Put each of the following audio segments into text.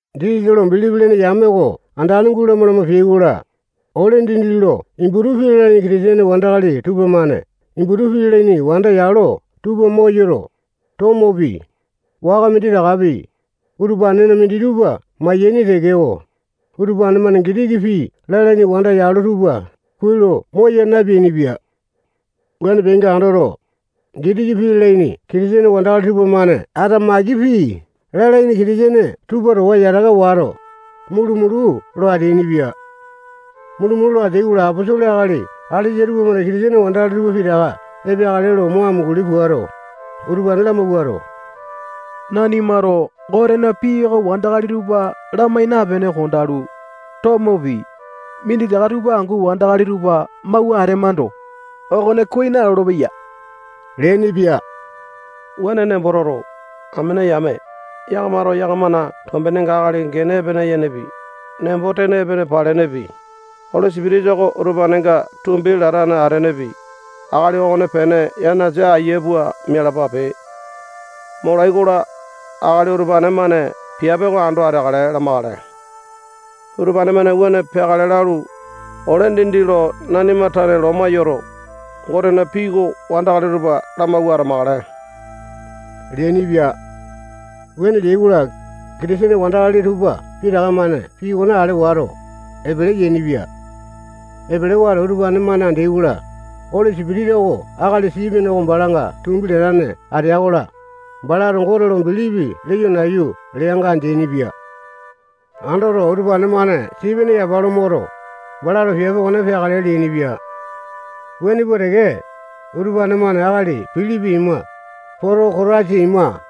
Jisasa lo bilipi lene yame oko andane gulama lama peai-kola, ole dindi lo Iputu pii lalaini Kitisene wandakali tupamane Iputu pii lalaini wanda yalo tupa moyoto, tomopi, waka minditakapi, utupanena minditupa maiyaini tekeko, utupane-mane Gitiki pii lalaini wanda yalo tupa kuai lo moya napeainipia. Wuane peainga andoto, Gitiki pii lalaini Kitisene wandakali tupamane Atamaiki pii lalaini Kitisene tupa towa yataka wato, mulu-mulu lo ateainipia. Mulu-mulu lo ateai-kola, aposolo akali alesa tupamane Kitisene wandakali tupa pitaka epeakale lo mo amunguli puato, utupane lamawuato, nanimato Gotena pii oko wandakali tupa lamai napene kondalu, tomopi, minditaka tupa angu wandakali tupa mawua atemando, okone kuai nalolo-peya leainipia. Wuane nembo toto, amene yame, yakamato yakamana tombenenga akali gene epene yenepi, nembo-tene epene palenepi, Oli Sipitisa oko utupanenga tumbi latane atenepi, akali okonepene yanasa aiya pua mialapape. Molai-kola, akali utupane-mane piape oko ando ateakale lamakale. Utupane-mane wuane peakale lalu, ole dindi lo nanima tane loma yoto, Gotena pii oko wandakali tupa lamawua atamakale leainipia. Wuane leai-kola, Kitisene wandakali tupa pitaka-mane pii okone ale wato, epele yainipia. Epele wato, utupane-mane andeai-kola, Oli Sipitisa oko akali Sipene oko balanga tumbi latane atea-kola, balato Gote lo bilipi leyo nayu leanga andeaini-pia. Andoto, utupane-mane Sipene yapa lo moto, balato piape okone peakale leainipia. Wuane pua teke, utupane-mane akali Pilipi ima, Potokotasa ima,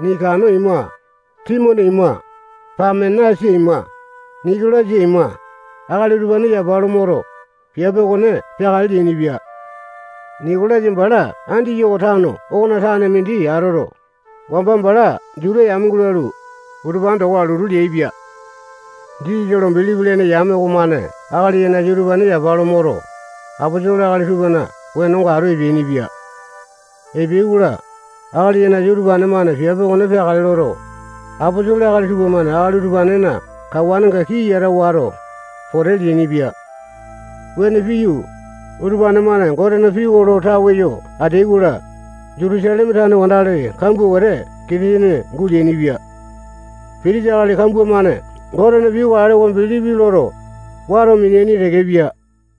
Nikano ima, Timone ima, Pamenasa ima, Nikolasa ima, akali utupane yapa lo moto, piape okone peakale leainipia. Nikolasa bala Andiyoko tano okona tane mindi atoto, wamba bala Juta yame gulalu, utupane towa lotu leaipia. Jisasa lo bilipi lene yame okomane akali yanasa utupane yapa lo moto, aposolo akali tupana wenonga atu epeainipia. Epeai-kola, akali yanasa utupane-mane piape okone peakale loto, aposolo akali tupamane akali utupanena kawanenga kii yata wato, pote leainipia. Wuane piyu, utupane-mane Gotena pii oko lo tawe yo ateai-kola, Jutusaleme tane wandakali kambua wete Kitisene guleainipia. Pitisa akali kambua-mane Gotena pii oko alewa bilipi loto, wato mineaini tekepia.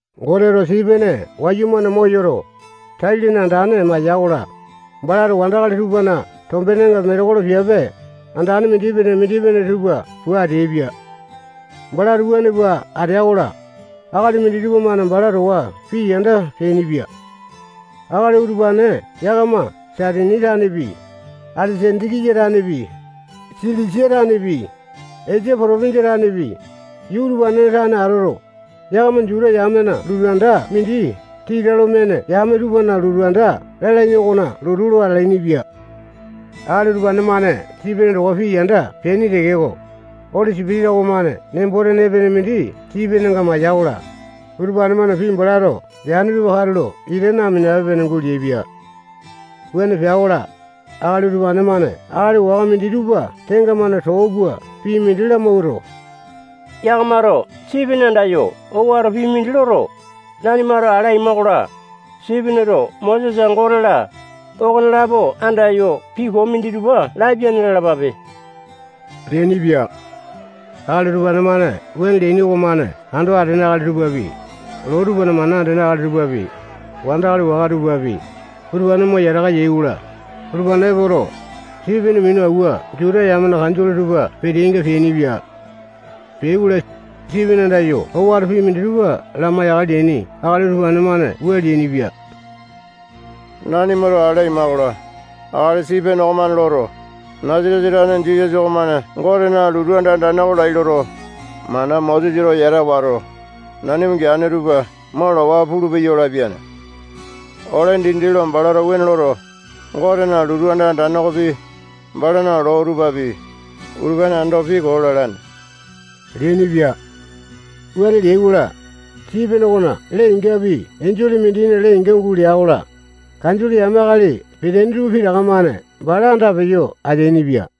Goteto Sipene wayumane moyoto, tai-lene andane maiya-kola, balato wandakali tupana tombenenga metekolo piape andane mindipene-mindipene tupa pua ateaipia. Balato wuane pua atea-kola, akali minditupa-mane bala towa pii yanda peainipia. Akali utupane yakama Saitini tanepi, Aleke-sandiya tanepi, Silisia tanepi, Esia potopinjia tanepi, yuu utupanena tane atoto, yakama Juta yamena lotu anda mindi Tita Lo Mene Yame Tupana Lotu Anda lalaini okona lotu lo atalainipia. Akali utupane-mane Sipene towa pii yanda peaini tekeko, Oli Sipitisa okomane nembo-tene epene mindi Sipenenga maiya-kola, utupane-mane pii balato leane tupa katulo ita naminape-pene guleaipia. Wuane pea-kola, akali utupane-mane akali waka minditupa tenga-mane too pua pii mindi lamawuato, yakamato Sipene andayo owato pii mindi loto, nanimato ale aima-kola, Sipeneto Mosesa, Gote-la, okonelapo andayo pii koo minditupa lapiane lalapape leainipia. Akali utupane-mane wuane leaini okomane ando atene akali tupapi, loo tupana mana andene akali tupapi, wandakali waka tupapi, utupane mo yataka yai-kola, utupane-mane epoto, Sipene minu awua Juta yamena kanjole tupa peteainga peainipia. Peai-kola, Sipene andayo owato pii minditupa lamai-yakale leaini akali tupamane wua leainipia: Nanimato ale aima-kola, akali Sipene okomane loto, Nasatesa tane Jisasa okomane Gotena lotu anda andane oko lai loto, mana Mosesato yata wato, nanima geane tupa mo lawa pulupeya lapiane. Ole dindi lo balato wuane loto, Gotena lotu anda andane okopi, balana loo tupapi, utupane ando pii koo lalane leainipia. Wuane leai-kola, Sipene okona lee-ingapi enjole mindina lee-inga gulea-kola, kanjole yame akali peteaini tupa pitaka-mane bala andapeyo ateaini-pia.